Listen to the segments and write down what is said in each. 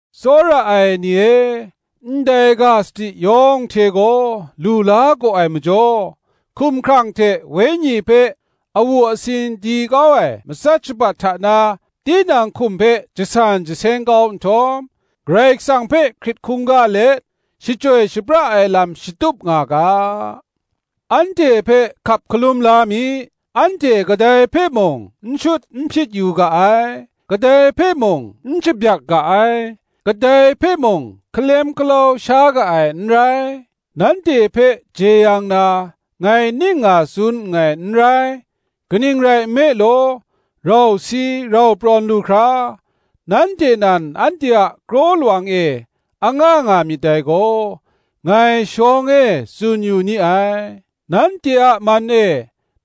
Tsawra ai ni e, ndai ga sadi yawng hte gaw lu la gaw ai majaw, hkumhkrang hte wenyi hpe awu asin di kau ai matsat shabat hta na tinang hkum hpe jasan jaseng kau nhtawm, Karai Kasang hpe hkrit hkungga let shachyoi shapra ai lam shatup nga ga. Anhte hpe hkap hkalum la mi: anhte kadai hpe mung n shut n hpyit yu ga ai; kadai hpe mung n shabyak ga ai; kadai hpe mung hkalem hkalau sha ga ai n rai. Nanhte hpe jeyang na ngai ning nga tsun nngai n rai; kaning rai nme law, rau si rau prawn lu hkra, nanhte nan anhte a kraw lawang e anga nga myit dai gaw, ngai shawng e tsun yu ni ai. Nanhte a man e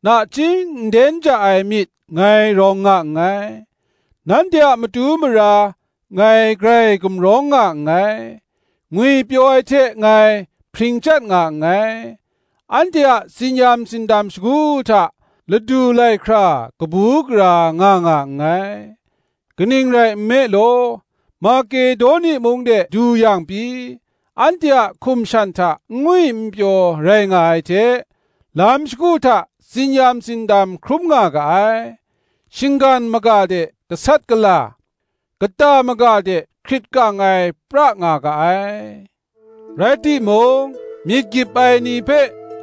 nachying nden ja ai myit ngai rawng nga nngai; nanhte a matu mara ngai grai gumrawng nga nngai; ngwipyaw ai hte ngai hpring chyat nga nngai; anhte a tsin-yam tsindam shagu hta ladu lai hkra kabu gara nga nga nngai. Kaning rai nme law, Makedoni mung de du yang pyi anhte a hkum shan hta n ngwi n pyaw rai nga ai hte, lam shagu hta tsin-yam tsindam hkrum nga ga ai; shinggan maga de gasat gala, kata maga de hkrit kang ai pra nga ga ai. Rai timung, myit gyip ai ni hpe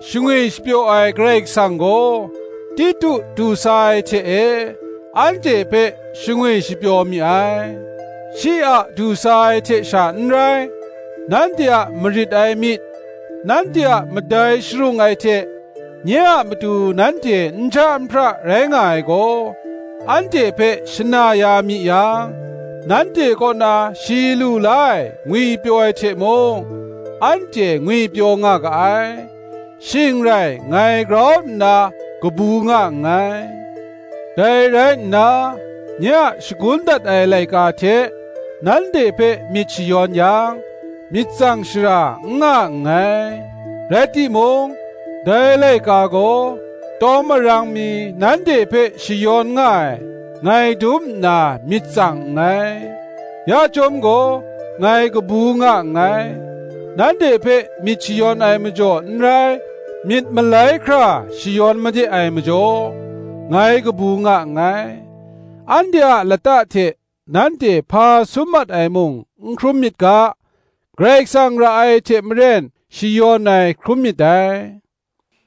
shangwi shapyaw ai Karai Kasang gaw, Titu du sa ai hte e anhte hpe shangwi shapyaw mi ai. Shi a du sa ai hte sha n rai, nanhte a marit ai myit, nanhte a madai sharung ai hte, nye a matu nanhte nja nhpra rai nga ai gaw, anhte hpe shana ya mi yang, nanhte kaw na shi lu la ai ngwipyaw ai hte mung, anhte ngwipyaw nga ga ai; shing rai ngai grau nna kabu nga nngai. Dai rai nna, nye a shagun dat ai laika hte nanhte hpe myit shayawn yang, myit tsang shara n nga nngai: rai timung, dai laika gaw tawng marang mi nanhte hpe shayawn nga ai, ngai dum nna myit tsang nngai; ya chyawm gaw ngai kabu nga nngai. Nanhte hpe myit shayawn ai majaw n rai, myit malai hkra shayawn made ai majaw, ngai kabu nga nngai; anhte a lata hte nanhte hpa sum mat ai mung n hkrum myit ga, Karai Kasang ra ai hte maren shayawn ai hkrum myit dai.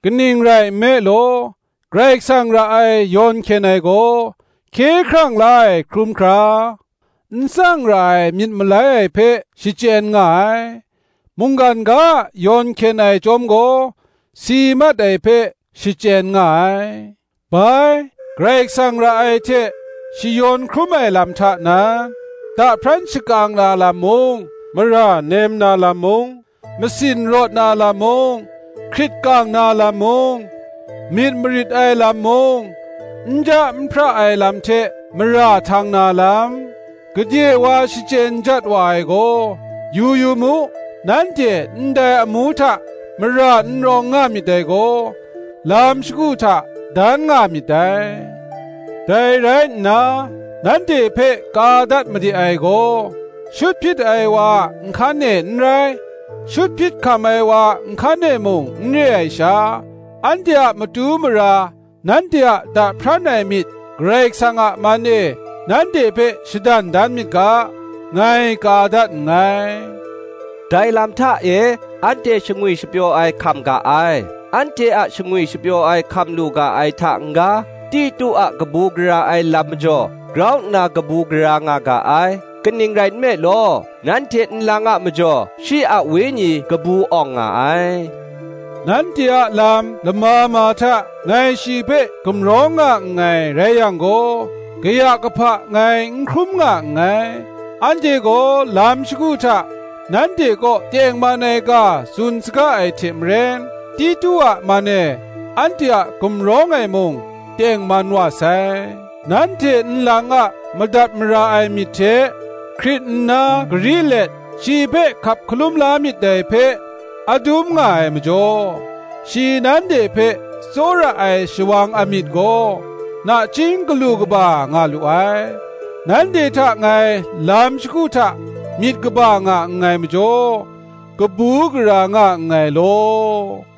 Kaning rai nme law, Karai Kasang ra ai yawn hkyen ai gaw, hkye hkrang la ai hkrum hkra, n tsang ra ai myit malai ai hpe shachyen nga ai; mungkan ga a yawn hkyen ai chyawm gaw, si mat ai hpe shachyen nga ai. Bai, Karai Kasang ra ai hte shayawn hkrum ai lam hta nan, da hpran shakang na lam mung, mara nem na lam mung, masin rawt na lam mung, hkrit kang na lam mung, myit marit ai lam mung, nja nhpra ai lam hte mara htang na lam, gade wa shachyen jat wa ai gaw, yu yu mu: nanhte ndai amu hta mara n rawng nga myit dai gaw, lam shagu hta dan nga myit dai. Dai rai nna, nanhte hpe ka dat made ai gaw, shut hpyit ai wa a nhkan e n rai, shut hpyit hkam ai wa a nhkan e mung n re ai sha, anhte a matu mara nanhte a da hpran ai myit Karai Kasang a man e nanhte hpe shadan dan myit ga, ngai ka dat nngai. Dai lam hta e anhte shangwi shapyaw ai hkam ga ai. Anhte a shangwi shapyaw ai hkam lu ga ai hta n-ga, Titu a kabu gara ai lam majaw grau nna kabu gara nga ga ai; kaning rai nme law, nanhte nlang a majaw shi a wenyi kabu awng nga ai. Nanhte a lam lama ma hta ngai shi hpe gumrawng nga nngai rai yang gaw, kaya kahpa ngai n hkrum nga nngai: anhte gaw lam shagu hta nanhte kaw tengman ai ga tsun saga ai hte maren, Titu a man e anhte a gumrawng ai mung tengman wa sai. Nanhte nlang a madat mara ai myit hte, hkrit nna gari let shi hpe hkap hkalum la myit dai hpe adum nga ai majaw, shi nanhte hpe tsawra ai shawang amyit gaw, nachying galu kaba nga lu ai. Nanhte hta ngai lam shagu hta myit kaba nga nngai majaw, kabu gara nga nngai law.